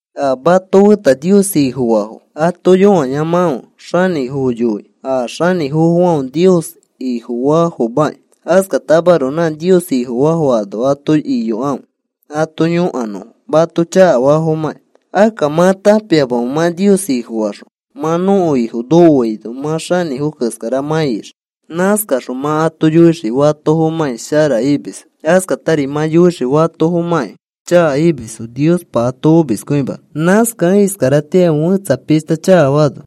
A mato feta Nios Ifofaafo ato yõayamakãfe xanĩfofo yoikĩ a xanĩfofofãfe Nios Ifofaafomaki. Askatamaroko nã Nios Ifofaafo ano ato iyokãfe ato yõkanõfo mato chakafafomakĩ. Akka, ¿mã tãpiamamẽ mã Nios Ifofaxõ mã nõko Ifo nokoaino mã xanĩfo keskara mã ixii? Nãskaxõ mã ato yoixii fatofomãkĩ shara imisfo. Askatari mã yoixii fatofomãkĩ chaka imisfo Niospa ato omiskõimanõ. Nãskakẽ iskaratĩari fẽtsa pishta chakafaano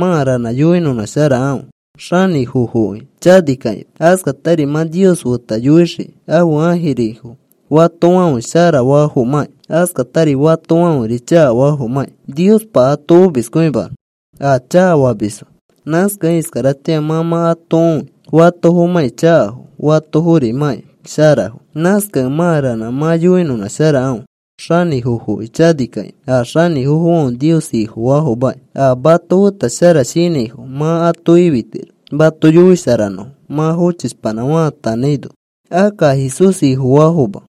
mã ranã yoinõnãsharakãfe xanĩfofoki chanikakĩma. Askatari mã Nios feta yoixii ãfe ãjirifo fatofãfe sharafafomãkĩ, askatari fatofãferi chakafafomãkĩ Niospa ato omiskõimanõ, a chakafamisfo. Nãskakẽ iskaratĩa mã mã ato õi fatofomãkĩ chakafo fatoforimãkĩ sharafo. Nãskakẽ mã ranã mã yoinõnãsharakãfe xanĩfofoki chanikakĩma a xanĩfofãfe Nios Ifofaafomaki. A mato feta shara shinãifo mã ato ifitiro mato yoisharanõfo, mã fochishpanã faatanãino. Akka a Jesús Ifofaafoma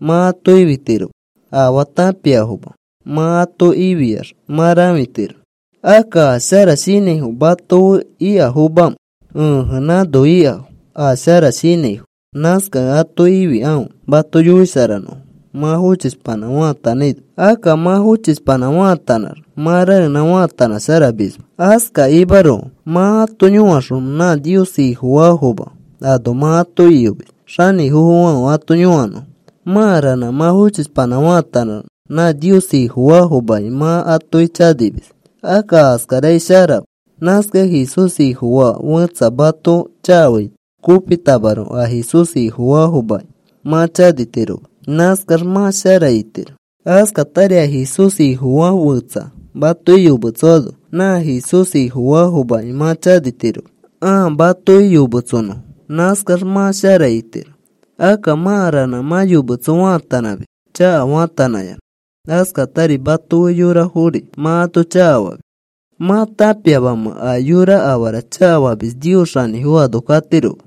mã ato ifitiroma. Afaa tãpiafoma mã ato ifiax mã rãfitiro. Akka, ¿a shara shinãifo mato fe ikafomamamẽ? Ẽje, nãno ikafo a shara shinãifo. Nãskakẽ ato ifikãfe mato yoisharanõfo mã fochishpanã faatanãino. Akka mã fochishpanã faatanãx, mã raenã faatanãsharamisma. Askakimaroko mã ato yõaxõ nã Nios Ifofaafoma ano mã ato iyomis xanĩfofofãfe ato yõkanõfo. Mã ranã mã fochispanã faatanãx nã Nios Ifofaafomaki mã atoki chanimis. Akka askarakai sharama. Nãskakẽ Jesús Ifofaa fẽtsa mato chakafaito kopitamaroko a Jesús Ifofaafomaki mã chanitiroma. Nãskax mã shara itiro. Askatari a Jesús Ifofaa fẽtsa matoki yometsoano nã Jesús Ifofaafomaki mã chanitiroma ãa matoki yometsonõfo. Nãskax mã shara itiro. Akka mã ranã mã yometso faatanãmis chaka faatanãyanã. Askatari mato fe yorafori mã ato chakafamis. ¿Mã tãpiamamẽ a yora afara chakafamis Nios xanĩfo ano katiroma?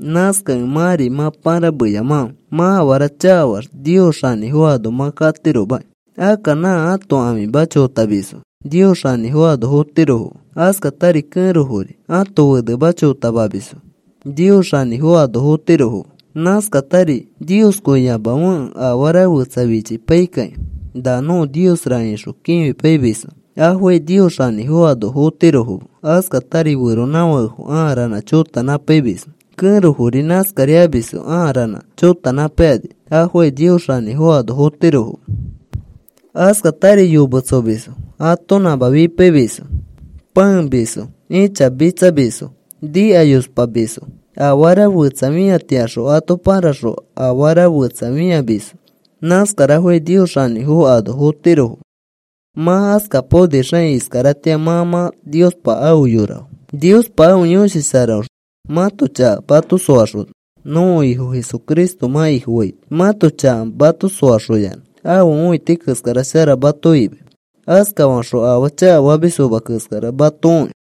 Nãskakẽ mãri mã pãrameyamakãfe. Mã afara chakafaax Nios xanĩfo ano mã katiromaki. Akka nã ãto ãfima chotamisfo Nios xanĩfo ano fotirofoma. Askatari kẽrofori ãto fenema chotamamisfo Nios xanĩfo ano fotirofoma. Nãskatari nioskõiyamafekẽ afara fetsa fichipaikĩ, “Na nõko niosra,” ixõ fichipaimisfo. Afokai Nios xanĩfo ano fotirofoma. Askatari feronãfakefo aa ranã chotanãpaimisfo. Kẽrofori nãskari amisfo aa ranã chotanãpaikani. Afokai Nios xanĩfo ano fotirofoma. Askatari yometsomisfo, atonãma fipaimisfo, pãemisfo, ĩchamitsamisfo, nikayospamisfo, afara fẽtsa fĩatiaxõ ato pãraxõ afara fetsa fĩamisfo. Nãskarafokai Nios xanĩfo ano fotirofoma. Mã askapaonixakĩ iskaratĩa mã mã Niospa afe yorafo. Niospa ãfe Yõshi Sharaõxõ mãto chaka mato soaxona nõko Ifo Jesucristo mã Ifofaito. Mãto chaka mato soaxoyanã ãfe õiti keskara shara mato imai. Askafaxõ afaa chakafamisfoma keskara mato õi.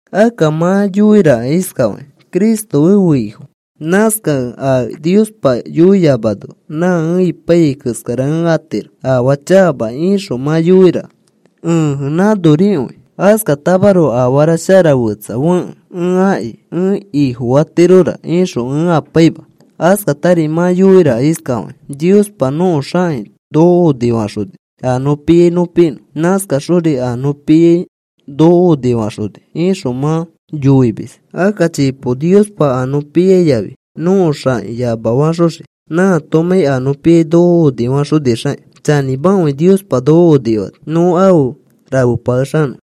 Akka mã yoiraka iskafakĩ: “Cristo ẽfe Ifo. Nãskakẽ a Niospa yoiyamano nã ẽ apaiyai keskara ẽ atiro, afaa chakama,” ixõ mã yoiraka. Ẽje, nãnorikõi. Askatamaroko afara shara fetsa fekẽ ẽ aki ẽ ifofatirora ixõ ẽ apaima. Askatari mã yoiraka iskafakĩ: “Niospa nõko xãki noko onifaxoni a nõ piai nõ pinõ. Nãskaxori a nõ piai noko onifaxoni,” ixõ mã yoimis. Akka chipo Niospa a nõ piai yafi nõko xãki yamafaxoxii nãatomãi a nõ piai noko onifaxonixakĩ. Chanĩmakõi Niospa noko onifani nõ afe rafepakexanõ.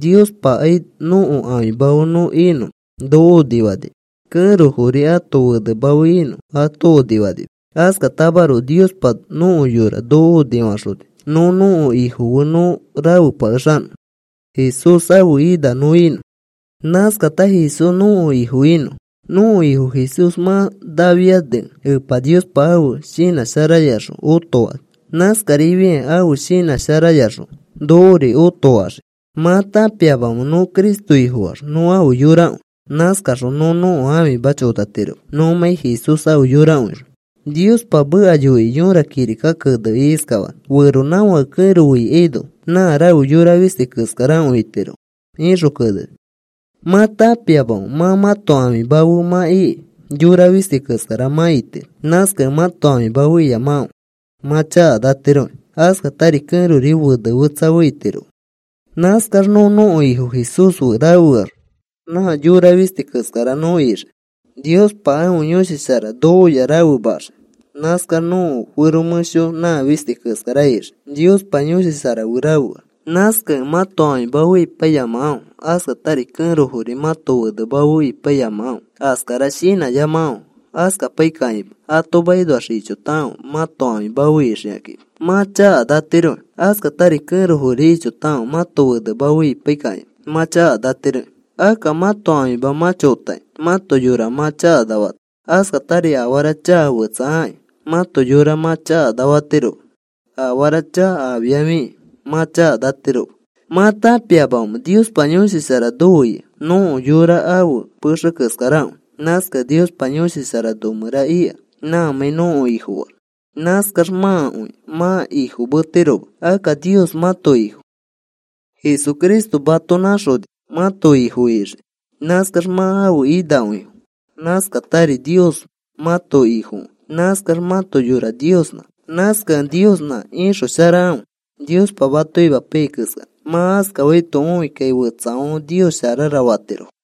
Niospakai nõko ãfima fe nõ inõ noko onifanima. Kẽrofori ãto fenema fe inõ ato onifanima. Askatamaroko Niospa nõko yora noko onifaxoni nõ nõko Ifo fe nõ rafepakexanõ, Jesús ãfe ina nõ inõ, nãskata Jesús nõko Ifo inõ. Nõko Ifo Jesús mã nafianikẽ Epa Niospa ãfe shinã sharayaxõ otofani. Nãskarifiakĩ ãfe shinã sharayaxõ nokori otofaxii. ¿Mã tãpiamamẽ nõ Cristo Ifofaax nõ ãfe yorakõi? Nãskaxõ nõ nõko ãfima chotatiroma nõmãi Jesús afe yorakõixõ. Niospa meka yoikĩ yõra kirika kenekĩ iskafani: “Feronãfake kẽro fe ikaino nã rafe yora fisti keskarakõi itirofo,” ixõ keneni. ¿Mã tãpiamamẽ, nã mãto ãfima fe mã ikĩ yora fisti keskara mã itiro? Nãskakẽ mãto ãfima fe iyamakãfe mã chakanatiroki. Askatari kẽrori fene fetsa fe itiroma. Nãskax nõ nõko Ifo Jesús fe rafeax nã yora fisti keskara nõ ixii. Niospa ãfe Yõshi Shara nokoya rafemaxii. Nãskax nõko fero mẽsho nã fisti keskara ixii Niospa Yõshi Shara fe rafeax. Nãskakẽ mãto ãfima fe ipaiyamakãfe. Askatari kẽrofori mãto fenema fe ipaiyamakãfe. Askara shinãyamakãfe. Askapaikakĩma ato makinoax ichotakãfe mãto ãfima fe ixikakĩma. Mã chakanatiroki. Askatari kẽrofori ichotakãfe mãto fenema fe ipai kakĩma mã chakanatiroki. Akka mãto ãfima mã chotakĩ mãto yora mã chakanafatiro. Askatari afara chaka fetsa akĩ mãto yora mã chakanafatiroma, afara chaka afiafikĩ mã chakanatiroma. ¿Mã tãpiamamẽ Niospa Yõshi Shara nofe ika? Nõko yora ãfe pexe keskarakõi. Nãskakẽ Niospa Yõshi Shara nõmẽra ika nãmãi nõko Ifofaax. Nãskax mãkõi mã ifofametiroma. Akka Nios mãto Ifo. Jesucristo mato nãxoni mãto Ifo ixikĩ. Nãskax mã ãfe inakõifo. Nãskatari Nios mãto Ifokõi. Nãskax mãto yora Niosnã. Nãskakẽ Niosnã ixosharakãfe Niospa mato imapaiyai keskara. Mã askafaito õikakĩ fetsafãfe, “Nios sharara,” fatirofo.